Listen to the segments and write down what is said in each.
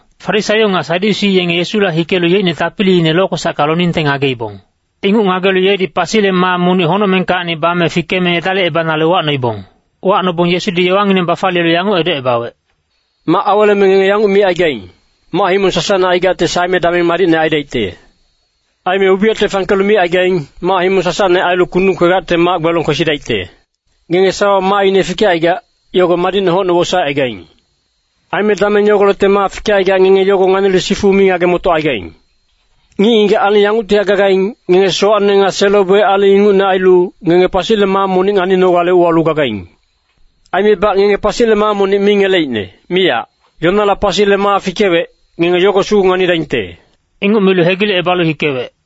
Farisaio nga Sadyusi yenge Yesula hikelu yeicne tapiliine lokwesacka loningte ngageibong. Inguc ngagelu yedi pasile maa monic honocmengkacni bame fikeme edalicebanale uwacnoibong. Uwacnobong Yesudi yowangineng bafaliyelu yanguc edocebawec, “Mac aweleme ngenge yanguc micaigaing, ‘Mac-himong sasacne aigacte saeme dameng madicne aidaicte.’ Aime ubiyacte fangkelu micaigaing, ‘Mac-himong sasacne ailu kundung kwegacte mac-gbelong kwesidaicte.’ Ngenge sawawa maaine fikecaigac, yogo madicne hocne wosaecaigaing. Aime dameng yagolecte maa fikecaigac ngenge yogo nganilu sifu mi ngage-motocaigaing. Ngic-ngigac aling yanguctihac gagaing, ngenge sowacne nga selo-boic aling ingucne ailu, ngenge pasile maa monic nganinogale uwalu gagaing. Aimebac ngenge pasile maa monic mi ngeleicne, miyac. Yonala pasile maa fikewec, ngenge yogo sugu nganidaingte.” Inguc milu hegilecebalu hikewec.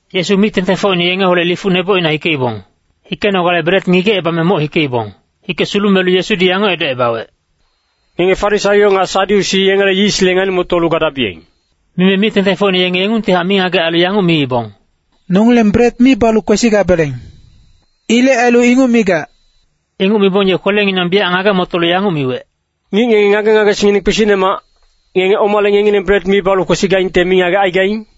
Yesu mic-tengtengfocine yengeholec lifuc nebocina hikeibong. Hikenogale bret ngigecebame moc hikeibong. Hike sulumelu Yesudi yanguc edocebawec, “Ngenge Farisaio nga Sadyusi yengele yisle ngani-motolu gadabiyeng.” Mime mic-tengtengfocine yenge yengungtihac mingagec ailu yanguc miibong, “Nongileng bret mi balu kwesigabeleng. Ilec ailu inguc migac.” Inguc mibong ye kwelenginang biyac ngage-motolu yanguc miwec, “Ngic ngenge ngage-ngagesingngineng kpisicnemac, ngenge omale ngengileng bret mi balu kwesigaingte mingagec aigaing?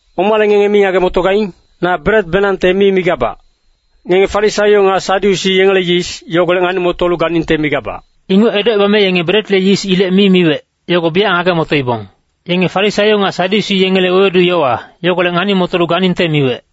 Omale ngenge mi ngage-motogaing? Na bretbenangte mi migabac. Ngenge Farisaio nga Sadyusi yengele yis, yogolec ngani-motolu ganingte migabac.” Inguc edocebame yenge bretle yis ilec mi miwec, yogo biyac ngage-motoibong. Yenge Farisaio nga Sadyusi yengele wewedu-yowa, yogolec ngani-motolu ganingte miwec.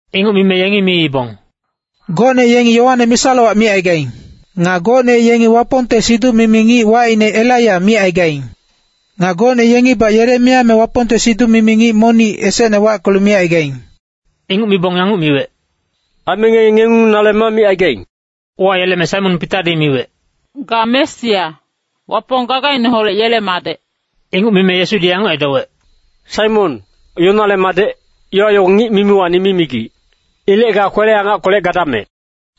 Inguc mime yengi miibong, “Gocne yengi Yoane misa-lowac micaigaing. Nga gocne yengi Wapongte siduc-mimi ngic wacine Elaiya micaigaing. Nga gocne yengibac Yeremiya me Wapongte siduc-mimi ngic monic esecne wackelu micaigaing.” Inguc mibong yanguc miwec, “Aime ngenge ngengung nale ma micaigaing?” Uwayeleme Saimon Pitadi miwec, “Ga Mesia, Wapong gagaineholec yele Madec.” Inguc mime Yesudi yanguc edowec, “Saimon, Yonale madec, yowa yogo ngic mimiwacni mi migic. Ilec ga kwele-angackolec gadamec.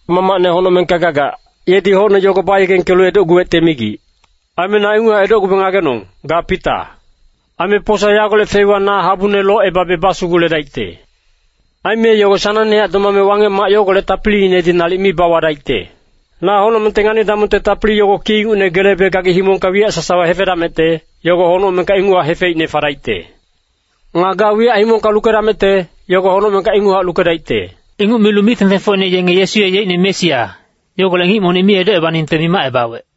Mamacne honocmengka gagac, yedi hocne yogo bayegengkelu edocguwecte migic. Aime na inguchac edocgube ngagenong, ga Pita. Aime posa yagolec feiwa na habune locebabe basuguledaicte. Aime yogo sanangnehac domame Wangec-mac yogolec tapiliinedi nalic mi bawadaicte. “Na honocmengte ngani-damongte tapili yogo ki ingucne gelebe gagi himongka wiyac sasawa hefedamecte, yogo honocmengka inguchac hefeicne fadaicte. Nga ga wiyac himongka lukedamecte, yogo honocmengka inguchac lukedaicte.” Inguc milu mic-tengtengfocine yenge Yesu ye yeicne Mesia, yogolec ngic monic mi edocebaningte mimacebawec.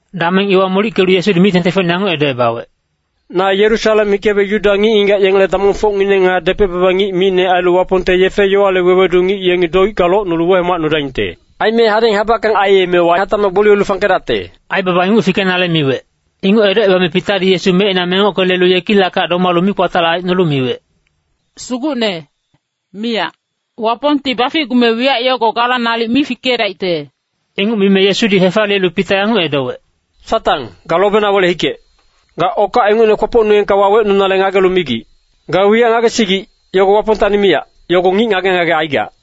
Dameng iwa molickelu Yesudi mic-tengtengfocine yanguc edocebawec,“Na Yerusalem hikebe Yuda ngic-ngigac yengele damongfocngineng nga depec-baba ngic micne ailu Wapongte yefe-yowale wewedu ngic yengi doicka locnulu wehomacnudaingte. Aime hadeng habackang aiyemewa hatacmac gboliyelu fangkedacte.” Aibaba inguc fikenale miwec. Inguc edocebame Pitadi Yesu mecina mengocke lelu yekilackac domalu mikpatalac aicnolu miwec, “Sugucne, miyac! Wapongti baficgume wiyac yogo gala nalic mi fikedaicte.” Inguc mime Yesudi hefaliyelu Pita yanguc edowec, “Satang, ga lobena wele-hikec. Ga okac ingucne kwopocnuengka wawecnunale ngagelu migic. Ga wiyac ngagesigic, yogo Wapongtacni miyac, yogo ngic ngage-ngage aigac.”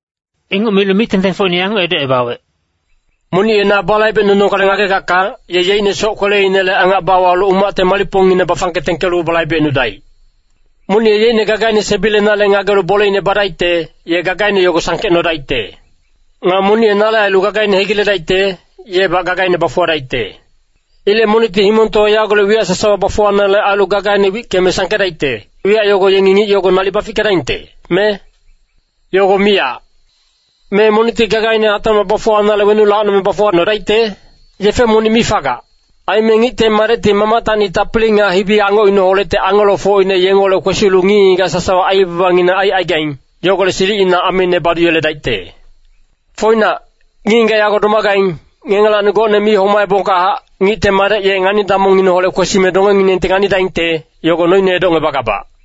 Inguc milu mic-tengtengfocine yanguc edocebawec, “Monic ye na balaibecnunogale ngagegacka, ye yeicne soc-kweleinele angac bawalu umacte malicpongine bafangke tengkelu balaibecnudaic. Monic ye yeicne gagaine sebilenale ngagelu boleine badaicte, ye gagaine yogo sangkecnodaicte. Nga monic ye nale ailu gagaine hegiledaicte, yebac gagaine bafuwadaicte. Ilec monicti himongtowa yagolec wiyac sasawa bafuwanale ailu gagaine wickeme sangkedaicte, wiyac yogo yengi ngic yogo nalic bafickedaingte, me? Yogo miyac! Me monicti gagaine hatacmac bafuwanale wenuc lacnome bafuwacnodaicte? Yefe monic mi fagac. Aime Ngicte Madecti Mamactacni tapili nga hibi-angocineholecti angelofocine yengeholec kwesilu ngic-ngigac sasawa aibabangineng aicaigaing, yogolec silicina ameine baduyeledaicte. Foinac, ngic-ngigac yago domagaing, ngengelacni gocne mi homaebongkahac, Ngicte Madec ye ngani-damongineholec kwesime dongenginengti nganidaingte, yogo noine edocngebagabac.”